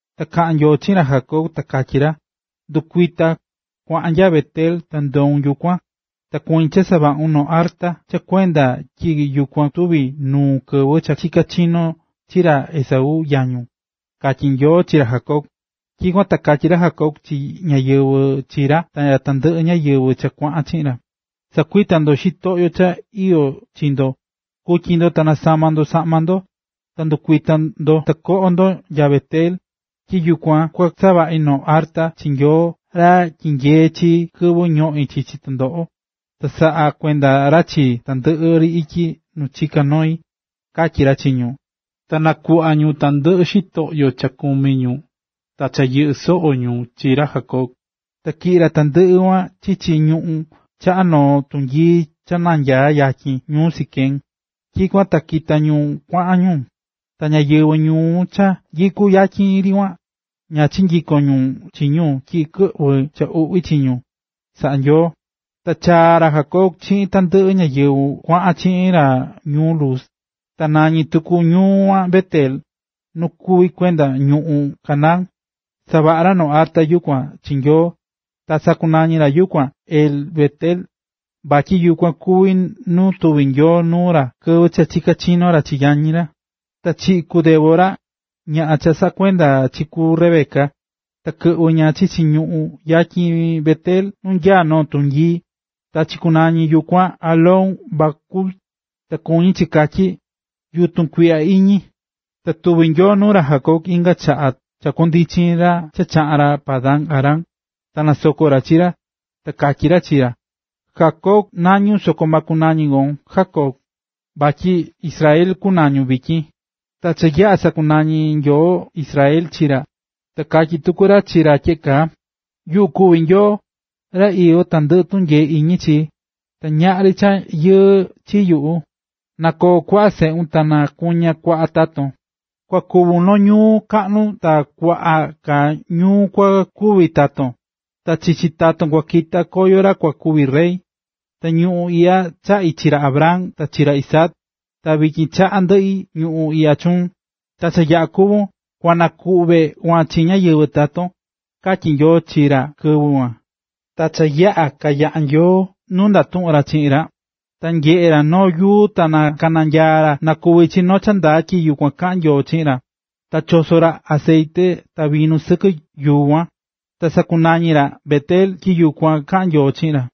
Ta kaꞌa̱n Nyoo chiꞌin ra Jacob ta katyí ra: “Ndu̱kuita, ta kua̱ꞌan nya Bet-el, ta ndoun yukuan, ta kuñí cha savaꞌun noo arta cha kuende tyi yukuan tuvi̱ nuun kɨvɨ cha chika̱ chinón chi ra Esaú, yañun”, katyí Nyoo chi ra Jacob. Tyikuan ta katyí ra Jacob chi ñáyɨvɨ chi ra ta tandɨꞌɨ ñáyɨvɨ cha kuaꞌan chiꞌin ra: ―Sa̱kuita ndo xitoꞌyo cha iyó chi ndo. Ku̱tyi ndo ta na̱sama ndo saꞌma ndo. Ta ndɨkuita ndo ta koꞌo ndo nya Bet-el, tyi yukuan kua savaꞌi noo arta chi Nyoo ra tyinyee̱ chii kɨvɨ ñoꞌí chichi tɨndoꞌo, ta saꞌá kuenda ra chii tandɨꞌɨ ri ityi nu chiká noi ―katyí ra chi ñu. Ta nakuꞌva̱ ñu tandɨꞌɨ xitoꞌyo cha kumí ñu ta cha yɨꞌɨ́ soꞌo ñu chi ra Jacob, ta tyiꞌi̱ ra tandɨꞌɨ kuan chichi ñuꞌún chaꞌa noo tunyii cha nyaá yatyin ñuu Siquem. Tyikuan ta kita̱ ñu kuaꞌan ñu, ta ñáyɨvɨ ñuu cha nyikú yatyin ri kuan, ña chinyiko̱n ñu chi ñu tyi kɨꞌvɨ̱ cha yuꞌví chi ñu, saꞌa̱ Nyoo. Ta chaa̱ ra Jacob chiꞌin tandɨꞌɨ ñáyɨvɨ kuaꞌan chiꞌin ra ñuu Luz, ta nañí tuku ñuu kuan Bet-el, nu kuví kuenda ñuꞌún Canaán. Savaꞌa̱ ra noo arta yukuan chi Nyoo, ta sakunañi̱ ra yukuan El-Bet-el, vatyi yukuan kuví nuu tuvi̱ Nyoo nuu ra kɨvɨ cha chika̱ chinó ra chi yañi ra. Ta chiꞌi̱ ku Débora, ñaꞌan cha saꞌakuenda̱ chi ku Rebeca, ta kɨꞌvɨ̱ ña chichi ñuꞌún yatyin Bet-el nu nanyaá noo tunyii. Ta chikunañi̱ yukuan Alón-bakut, ta kuñí chi katyí “Yutun tukuiꞌya iñi”. Ta tuvi̱ Nyoo nuu ra Jacob inga chaꞌa cha kuandichi̱ ra cha chaꞌa̱n ra Padan-aram, ta nasoko̱ ra chi ra. Ta katyí ra chi ra: “Jacob nañún soko ma kunañi kon Jacob, vatyi Israel kunañun vityin.” Ta cha yaꞌa̱ sakunañi̱ Nyoo “Israel” chi ra, ta katyí tuku ra chi ra tyeꞌe kaa: “Yuꞌu kuví Nyoo, ra iyó tandɨꞌɨ tunyee iñi chi, ta ñaꞌri cha yɨɨ chi yuꞌu, na koo kuaꞌa seꞌun ta na nakuña kuaꞌa taton. Kua kuvun noo ñuu kaꞌnu ta kuaꞌa ka ñuu kua kuvi taton, ta chichi taton kua kita koyo ra kua kuvi rey. Ta ñuꞌún iꞌya chaꞌi̱ chi ra Abraham ta chi ra Isaac, ta vityin chaꞌá ndɨꞌi ñuꞌún iꞌya chuun, ta cha yaꞌa̱ kúvun, kua nakuꞌve kuan chi ñáyɨvɨ taton”, katyi̱ Nyoo chi ra kɨvɨ kuan. Ta cha yaꞌa̱ kanyaꞌa̱ Nyoo nu ndatuꞌu̱n ra chiꞌin ra, ta keꞌe̱n ra noo yuu ta nakananyaa̱ ra na kuvi chi cha ndaa tyi yukuan kaꞌa̱n Nyoo chiꞌin ra, ta choso̱ ra acetye ta vinu sɨkɨ yuu kuan. Ta sakunañí ra Bet-el tyi yukuan kaꞌa̱n Nyoo chiꞌin ra.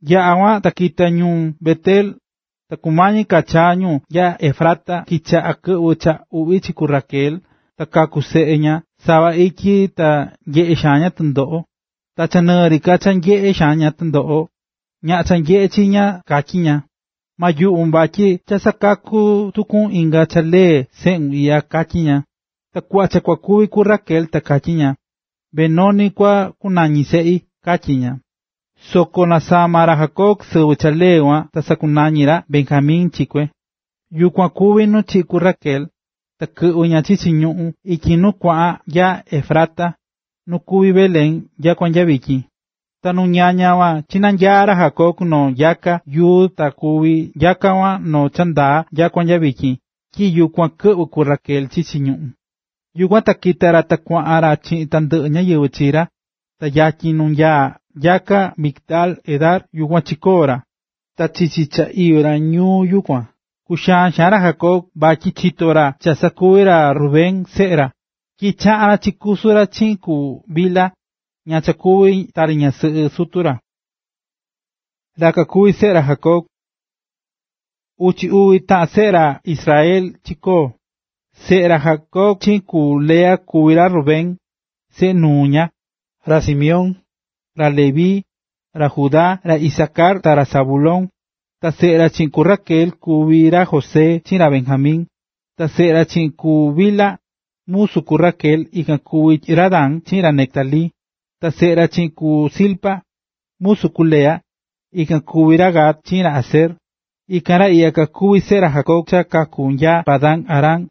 Yaꞌa̱ kuan, ta kita ñu Bet-el, ta kumañi ka chaa ñu nya Efrata kichaꞌa̱ kɨꞌvɨ cha uꞌvi chi ku Raquel ta kaku̱ seꞌe ña sava ityi ta nyeꞌe̱ xaan ña tɨndoꞌo. Ta cha nɨɨ ri ka cha nyeꞌé xaan ña tɨndoꞌo, ñaꞌan cha nyeꞌé chi ña katyí ña: “Ma yuꞌvun vatyi cha sakaku̱ tukun inga ra lee seꞌun iꞌya”, katyí ña. Ta kuꞌva cha kua kúvi ku Raquel ta katyí ña: ―Benoni kua kunani seꞌi ―katyí ña. Soko nasama̱ ra Jacob sɨvɨ cha lee kuan ta sakunañi̱ ra Benjamin chi kue. Yukuan kuví nu chiꞌi̱ ku Raquel, ta kɨꞌvɨ̱ ña chichi ñuꞌún yuꞌu ityi nu kuaꞌan nya Efrata, nu kuví Belén nyakua nya vityin. Ta nu ñaña kuan chinanyaa̱ ra Jacob noo nyakaa yuu ta kuví nyaka kuan noo cha ndaa nyakua nya vityin, tyi yukuan kɨꞌvɨ̱ ku Raquel chichi ñuꞌún. Yukuan kita̱ ra ta kuaꞌan ra chiꞌin tandɨꞌɨ ñáyɨvɨ chi ra, ta yatyin nu nyaá nyaka Migdal-edar, yukuan chikoo̱ ra. Ta chichi cha iyó ñu yukuan, kuxaán xaan ra Jacob vatyi chito̱ ra cha sakuvi̱ ra Rubén, seꞌe ra, tyi chaꞌa̱n ra chikusu̱ ra chiꞌin ku Bilha, ña cha kuví tari ñasɨꞌɨ sutu ra. Ra kakuví seꞌe ra Jacob Ta uchi uvi taꞌan seꞌe ra Israel chikoo̱. Seꞌe ra Jacob chiꞌin ku Lea kuví ra Rubén, seꞌe nuu ña, ra Simeón, ra Leví, ra Judá, ra Isacar ta ra Zabulón. Ta seꞌe ra chiꞌin ku Raquel, ikan kuví ra José chiꞌin ra Benjamin. Ta seꞌe ra chiꞌin ku Bilha, musu ku Raquel, ikan kuví ra Dan chiꞌin ra Neftalí. Ta seꞌe ra chiꞌin ku Zilpa, musu ku Lea, ikan kuví ra Gad chiꞌin ra Aser. Ikan ra iꞌya kakuví seꞌe ra Jacob cha kaku̱ nya Padan-aram.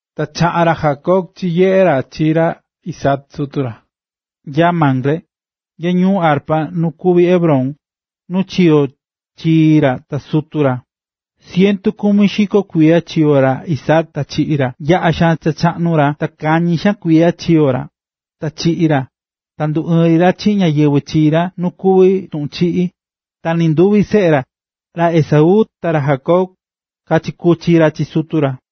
Ta chaꞌa̱n ra Jacob chinyeꞌe̱ ra chi ra Isaac, sutu ra, nya Mamre, nya ñuu Arba nu kuví Hebrón, nu chiyo̱ chii ra ta sutu ra. Cientu kumi xiko kuiya chiyo̱ ra Isaac ta chiꞌi̱ ra. Yaꞌa̱ xaan cha chaꞌnu ra ta kañi xaan kuiya chiyo̱ ra, ta chiꞌi̱ ra, ta nduɨɨ̱n ri ra chiꞌin ñáyɨvɨ chii ra nu kuví tuꞌun chiꞌí. Ta nɨnduvi seꞌe ra, ra Esaú ta ra Jacob, kachikuchi̱ ra chi sutu ra.